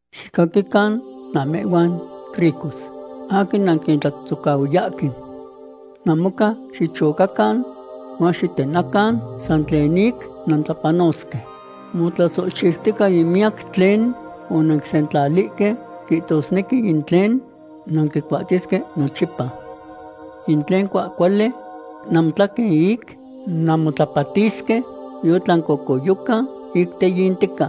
Xicaquican namehhuan ricos aquin nanquintlatzohtzohcahuiyahque. Namocan xichocacan huan xitenacan san tlen ic nantlapanosque. Motlasohchiutica in miyac tlen onanquisentlalihque; quihtosnequi in tlen nanquicuahtiyesque nochipa. In tlen cuahcuali namotlaquen ic nanmotlapatisque yotlan cocoyoca ic teyintica.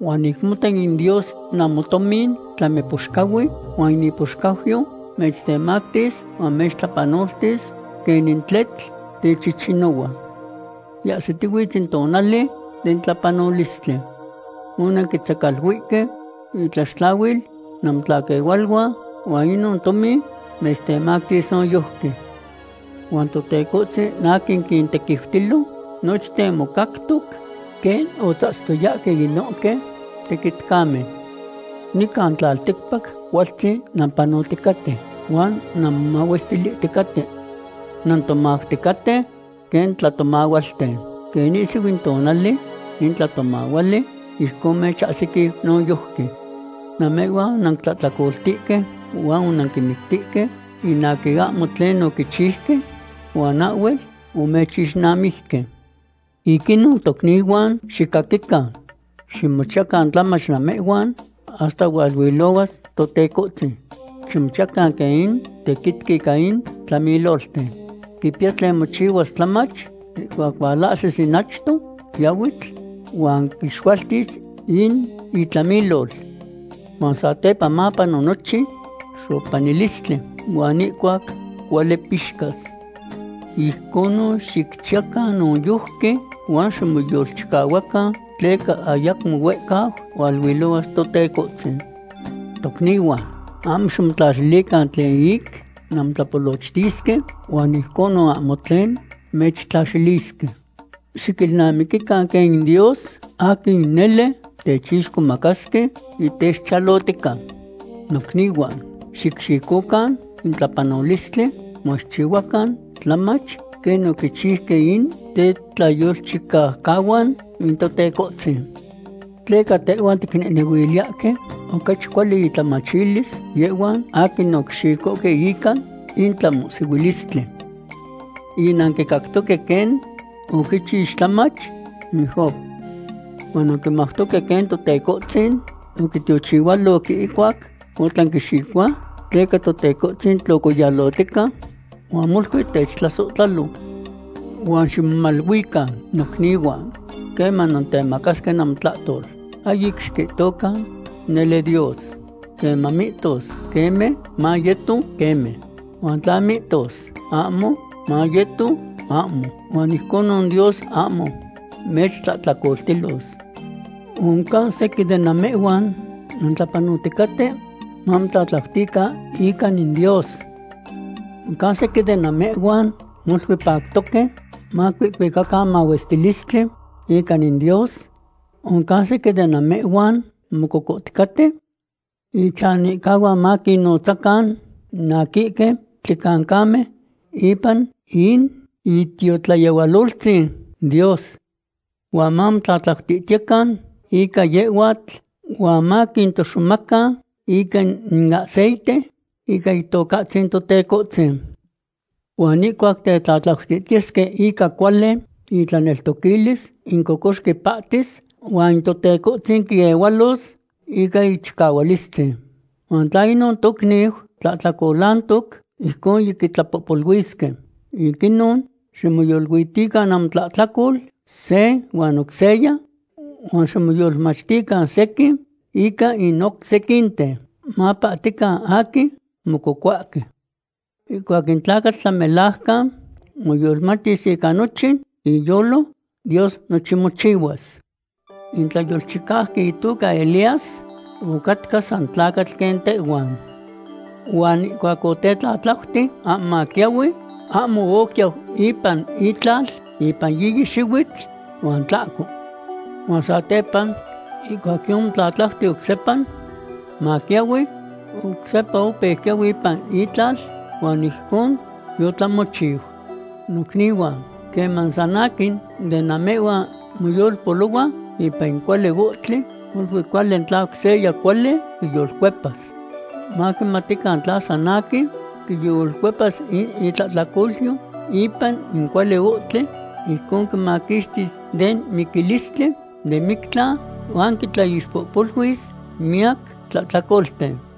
Huan ic mota in Dios namotomin tlami poxcahui huan in ipoxcauyo mechtemactis huan mechtlapanoltis quenin tletl techichinohua. Yiahsitihuitz in tonali den tlapanolistli. Onanquintzecaluihque intlaxtlahuil namotlaquehualuan, huan inon tomin mechtemactis noyojqui. Huan Totecohtzin aquin quintequiutilo nochten mocactoc quen otzahtzihtoyahque inohque tequitcamen. Nican tlalticpac cualtzin nampanoticaten huan nanmomahuesohticaten. Nantomauticaten quen tlatomahualten. Quen ahsiquiu in itonal in tlatomahuali, ijcon mechahsiquiu noyojqui. Namehhuan onanquintlahtlacoltihque huan onanquinmictihque in aquin ahmo tlen oquichiuque, huan ahhuel omechixnamijque. Ic inon tocnihuan, xicaquican. Ximochiyacan tlamach namehhuan hasta hualuilohuas Totecohtzin. Ximochiyacan quen in tequitqui ica in tlamilolten. Quipiya tlen mochiyas tlamach ihcuac hualahsis in achto quiahuitl huan quixualtis in itlamilol. Huan satepa mapano nochin xopanilistli, huan ihcuac cuali pixcas. Ijconon xicchiyacan noyojqui, huan ximoyolchicahuacan, tleca ayacmo huehcau hualuilohuas Totecohtzin. Tocnihuan, ahmo ximotlaxilican tlen ic nanmotlapolochtisque, huan ijcon ahmo tlen mechtlaxilisque. Xiquilnamiquican quen in Dios aquin nele techixcomacasque yitechchiyalotica. Nocnihuan, xicxicocan in tlapanolistli huan xicchiyacan tlamach quen oquichiuque in tetlayolchicaucahuan in Totecohtzin. Tleca tehhuan ticnehnehuiliyahque ocachi cuali intlamachilis yehhuan aquin oquixicohque ica in tlamohsihuilistli. Yinanquicactoque quen oquichix tlamach in Job. Huan nanquimautoque quen Totecohtzin oquitiochihualoc ihcuac otlanquixicohua, tleca Totecohtzin tlocoyalotica huan molui techtlasohtlalo. Huan ximomaluican, nocnihuan, queman nantemacasque namotlahtol. Ahyic xiquihtocan: “Nele Dios.” Queman mihtos: “Queme”, mayeto: “Queme.” Huan tla mihtos: “Ahmo”, mayeto: “Ahmo”, huan ijcon Dios ahmo mechtlahtlacoltilos. ¿Oncan sequin de namehhuan nantlapanoticaten? ¡Mamotlatlautican ica in Dios! ¿Oncan sequin de namehhuan molui pactoque? ¡Macuihcuicacan mahuestilistli ica in Dios! ¿Oncan sequin de namehhuan mococohticaten? Ichanihcahuan maquinnonotzacan in aquihque tlicancamen ipan in itiotlayehualoltzin Dios. Huan mamotlatlautihtiyecan ica yehhuatl, huan maquitohtoxomacan ica in aceite ica Itocahtzin Totecohtzin. Huan ihcuac tetlatlautihtiyesque ica cuali intlaneltoquilis, in cocoxqui pahtis, huan Totecohtzin quiehualos ica ichicahualistzin. Huan tla inon tocniu tlahtlacolantoc, ijcon yiquitlapohpoluisque. Ic inon, ximoyoluitican namotlahtlacol se huan oc seya, huan ximoyolmachtican sequin ica in oc sequinten, mapahtican aquin mococohuahque. Ihcuac in tlacatl tlamelajcan moyolmachtis ica nochin iyolo, Dios nochin mochihuas. In tlayolchicauqui itoca Elías ocatca san tlacatl quen tehhuan. Huan ihcuac otetlatlauti ahmo maquiahui, ahmo oquiau ipan itlal ipan yiyi xihuitl huan tlahco. Huan satepa, ihcuac yomotlatlauti oc sepa maquiahui, oc sepa opeu quiahui ipan itlal huan ijcon yotlamochiu. Nocnihuan, queman san aquin de namehhuan moyolpolohua ipan in cuali ohtli, molui cuali tla oc seya cuali quiyolcuepas. Maquimatican tla san aquin quiyolcuepas in tlahtlacolyo ipan in cuali ohtli, ijcon quimaquixtis den miquilistli den mictlan, huan quitlaixpohpoluis miyac tlahtlacolten.